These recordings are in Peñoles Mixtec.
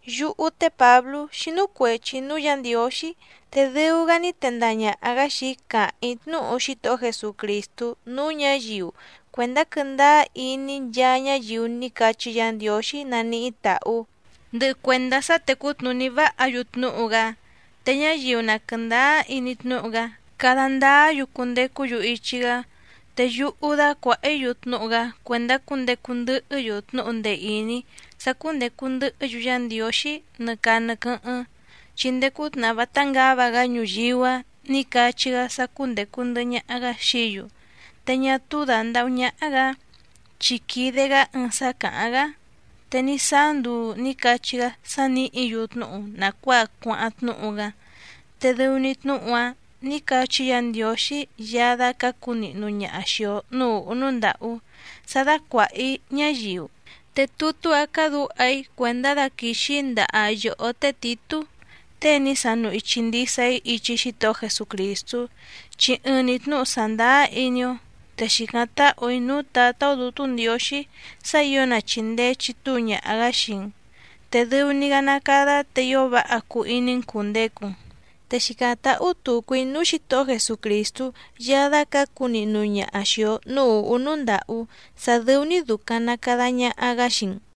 Yúhú té Pǎblú xínú cuèchi‑í núú Yǎ Ndiǒxí, te dɨu‑gá ní tendaha ñàha‑gá xii‑í càháⁿ‑í tnúhu Xítohó Jesucrìstú núú ñǎyiu cuèndá quɨ́ndáá iní nchaa ñáyiu ní cachí Yǎ Ndiǒxí naníhí tàhú, ndɨhɨ cuèndá sá tècú tnùní váha‑yu tnúhu‑gá, te ñáyiu na quɨ̀ndáá iní tnúhu‑gá cada ndáá‑yu cundecú‑yu ichi‑gá. Te yúhú dácuàha‑í‑yu tnúhu‑gá cuèndá cundecu ndɨhɨ́‑yu tnúhu ndee ìní sá cúndècu ndɨhɨ́‑yu Yá Ndiǒxí nɨ caa nɨ quɨ́hɨ́ⁿ, chi ndéé cútnàhá vátá ngǎva‑gá ñuyíú‑a ní cachí‑gá sá cúndècu ndɨhɨ ñaha‑gá xií‑yu, te ñá túú dàndahú ñáhá‑gǎ, chi quìde‑gá ɨɨⁿ sá càháⁿ‑gá. Te ní sáá nduu nǐ cachí‑gá sá nìhí‑yu tnúhu nàcuáa cuáháⁿ tnúhu‑gá, te dɨu‑ni tnúhu‑áⁿ nǐ cachí Yǎ Ndiǒxí Yaá dácǎcu nihnu ñaha xìi‑o núú ùhú núú ndàhú sá dácuàha‑í ñáyiu. Te tutú‑a càdúha‑í cuèndá daquìxi‑í ndaha yòhó té Tìtú, tée ní sanu ichi ndisa‑í ichi Xítohó Jesucrìstú, chi ɨɨⁿ‑ni tnǔhu sàndáá iní‑ó. Te xìcáⁿ táhù‑í núú Tǎtá‑ó Dǔtú Ndiǒxí sá ǐo na chìndee chitúu ñaha‑gǎ xii‑n, te dɨu‑ni‑gá ná càda te ío váha cuu iní‑n cùndecu‑n. Te xìcáⁿ táhú tùcu‑í núú Xǐtohó Jesucrìstú Yaá dácǎcu nihnu ñaha xìi‑o núú ùhú núú ndàhú sá dɨ́ú‑ní dùcaⁿ na cada ñaha‑gá xii‑n.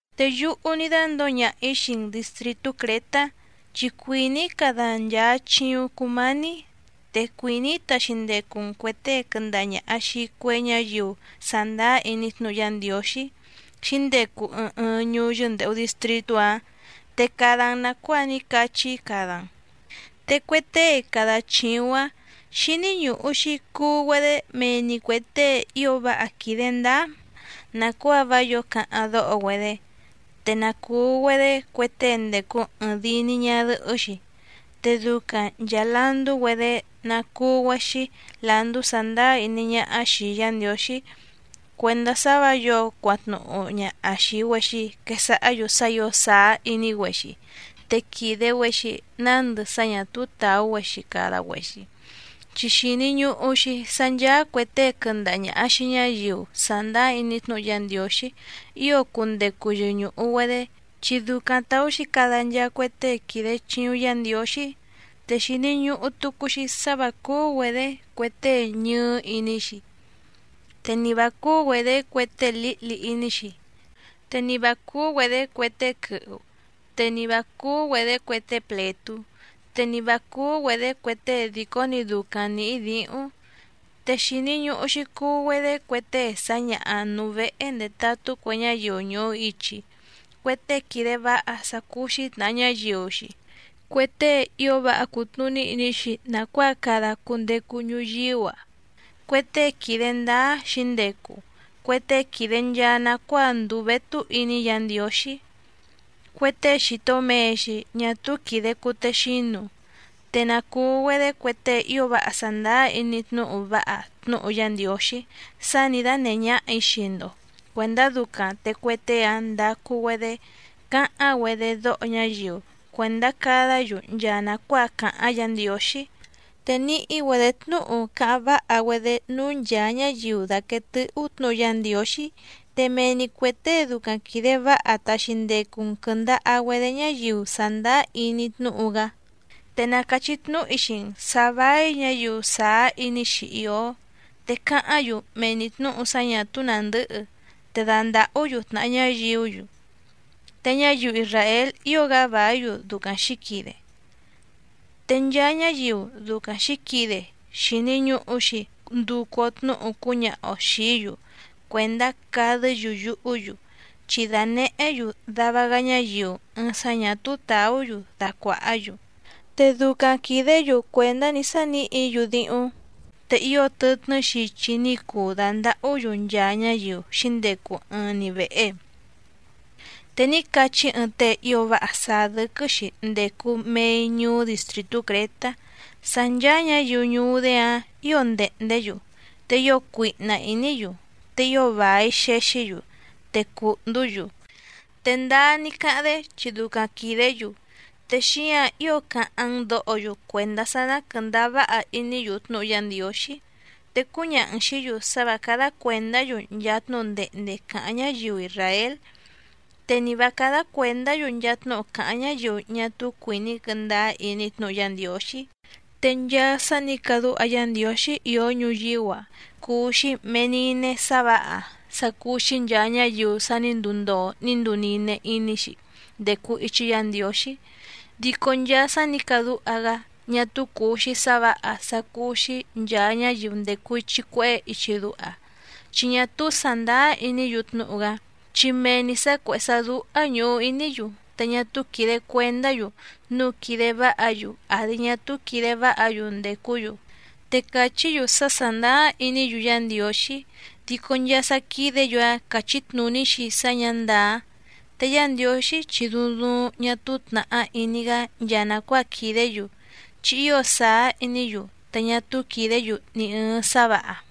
Te yúhú ní dándǒo ñaha‑ǐ xii‑n dìstritú Crětá, chi cuìní‑í cada‑n nchàa chiuⁿ cumání, te cuìní‑í taxi ndecu‑n cuè tée quɨndaha ñàha xii cue ñáyiu sàndáá iní tnúhu Yá Ndiǒxí xǐndecu ɨɨⁿ ɨɨⁿ ñuú yɨ́ndèhu distritú‑áⁿ, te cada‑n nàcuáa ní cachí‑í cada‑n. Te cue tée cada chìuⁿ‑áⁿ xíní ñùhu‑xi cuu‑güedé mee‑ni cuè tée ío váha quìde ndáá nàcuáa vá yǒo cáháⁿ dóho‑güedé, te na cùu‑güedé cue tée ndècu ɨɨⁿ dii‑ni ñadɨhɨ́‑xi. Te ducaⁿ nchàa landú‑güedé ná cùu‑güexi landú sàndáá iní ñáhá xìi Yá Ndiǒxí cuèndá sá vǎ yǒo cuatnuñàha xii‑güexi quesahá‑yu sá ǐo sàá iní‑güexi te quìde‑güexi nándɨ sá ñà túú tàú‑güexi cada‑güexi. Chi xìni ñuhu‑xi sá ncháá cuè tée quɨndaha ñàha xii ñáyiu sàndáá iní tnúhu Yá Ndiǒxí ío cundecu yɨñùhu‑güedé, chi ducaⁿ tàú‑xi cada nchaa cue tée quìde chiuⁿ Yá Ndiǒxí, te xìni ñuhu tucu‑xi sá vǎ cúú‑güedě cue tée ñɨɨ́ iní‑xi, te ni vǎ cúú‑güedě cue tée lǐhli iní‑xi, te ni vǎ cúú‑güedě cue tée quɨhu, te ni vǎ cúú‑güedě cue tée plètú, te ni vǎ cúú‑güedě cue tée dìcó‑ni ducaⁿ nǐhí dǐhúⁿ. Te xìni ñuhu‑xi cuu‑güedé cue tée sǎñaha nùu vehe ndetatú cue ñáyiu ñùhu ichi, cue tée quìde váha sá cúú‑xí tnàha ñáyiu‑xi, cue tée ío váha cùtnuní iní‑xi nàcuáa cada cundecu ñuyíú‑a, cue tée quìde ndáá xǐndecu, cue tée quìde nchaa nacuáa ndùu vétú iní Yǎ Ndiǒxí, cue tée xìto mee‑xi ñá túú quìde cutexínu. Te na cùu‑güedé cue tée ío váha sàndáá iní tnúhu váha tnúhu Yá Ndiǒxí sá nǐ dánèhé ñáhà‑í xii‑ndo cuèndá ducaⁿ te cue tée‑áⁿ ndacu‑güedé cáháⁿ‑güedé dóho ñáyiu cuèndá cádǎ‑yu nchaa nàcuáa càháⁿ Yǎ Ndiǒxí, te níhí‑güedě tnúhu cáháⁿ váha‑güedé núú nchàa ñáyiu dàquee tɨ́hú tnǔhu Yá Ndiǒxí, te mee‑ni cuè tée ducaⁿ quìde váha taxi ndecu‑n quɨ̀ndaha‑güedé ñáyiu sàndáá iní tnúhu‑gá. Te na càchí tnúhu‑í xii‑n sǎ váí ñǎyiu sàá iní‑xi ìó, te càháⁿ‑yu mee‑ni tnǔhu sá ñà túú nàndɨ́hɨ, te dàndahú‑yu tnàhá ñáyiú‑yu, te ñáyiu isràél ío‑gá vàí‑yu ducaⁿ xǐquide. Te nchaa ñáyiu ducaⁿ xǐquide xìni ñuhu‑xi nducu‑o tnúhu cúñaha‑o xìí‑yu cuèndá cadɨ́‑yu yuhú‑yu, chi dànehé‑yu dava‑gá ñáyiu ɨɨⁿ sá ñà túú tàú‑yu dacuàhá‑yu, te ducaⁿ quìdé‑yu cuèndá‑ni sá nìhí‑yu díhúⁿ, te ío tɨtnɨ́ xichi ní cuu dàndahú‑yu nchaa ñáyiu xǐndecu ɨɨⁿ‑ni vèhe. Te ní cachí ɨɨⁿ tée ío váha sàá dɨ́quɨ́‑xi ndècu mei ñuú distrìtú Crětá sá ncháá ñǎyiu ñuú‑dé‑áⁿ ǐo ndèhndé‑yu, te ío cuihna ìní‑yu, te ío vài xexí‑yu, te cùhndú‑yu. Te ndáá ní cáháⁿ‑dé chi ducaⁿ quìdé‑yu, te xíǎⁿ ío cáháⁿ‑n dǒho‑yu cuèndá sá ná quɨ̀ndáá váha iní‑yu tnúhu Yá Ndiǒxí. Te cúñaha‑n xìí‑yu sá vǎ cádá cuèndá‑yu nchaa tnúhu ndehnde càháⁿ ñáyiu isràél, te ni vǎ cádá cuèndá‑yu nchaa tnúhu càháⁿ ñáyiu ñá túú cuìní quɨ́ndáá iní tnúhu Yá Ndiǒxí. Te nchaa sá nǐ cadúha Yá Ndiǒxí ìó ñuyíú‑a cùu‑xi mee nine‑ni sá vǎha sá cúú‑xí nchàa ñáyiu sa ní nduu ndoo ní nduu nine iní‑xi ndècu ichi Yá Ndiǒxí. Dico nchaa sá nǐ cadúha‑gá ñá túú cùu‑xi sá vǎha sá cúú‑xí nchàa ñáyiu ndècu ichi cuehé ichi duha, chi ñá túú sàndáá iní‑yu tnúhu‑gá, chi mee‑ni sǎ cuèhé sá dúhá ñùhu iní‑yu, te ñá túú quìde cuendá‑yu núu quìde váha‑yu àdi ñá túú quìde váha‑yu ndècú‑yu. Te càchí‑yu sá sàndáá iní‑yu Yá Ndiǒxí, dico nchaa sá quídě‑yu‑áⁿ càchí tnùní‑xi sá ñǎ ndàá. Te Yá Ndiǒxí chi duuⁿ duuⁿ ñá túú tnàhá iní‑gá nchaa nàcuáa quìdé‑yu, chi ío sàá iní‑yu, te ñá túú quìdé‑yu ni ɨ̀ɨⁿ sá vǎha.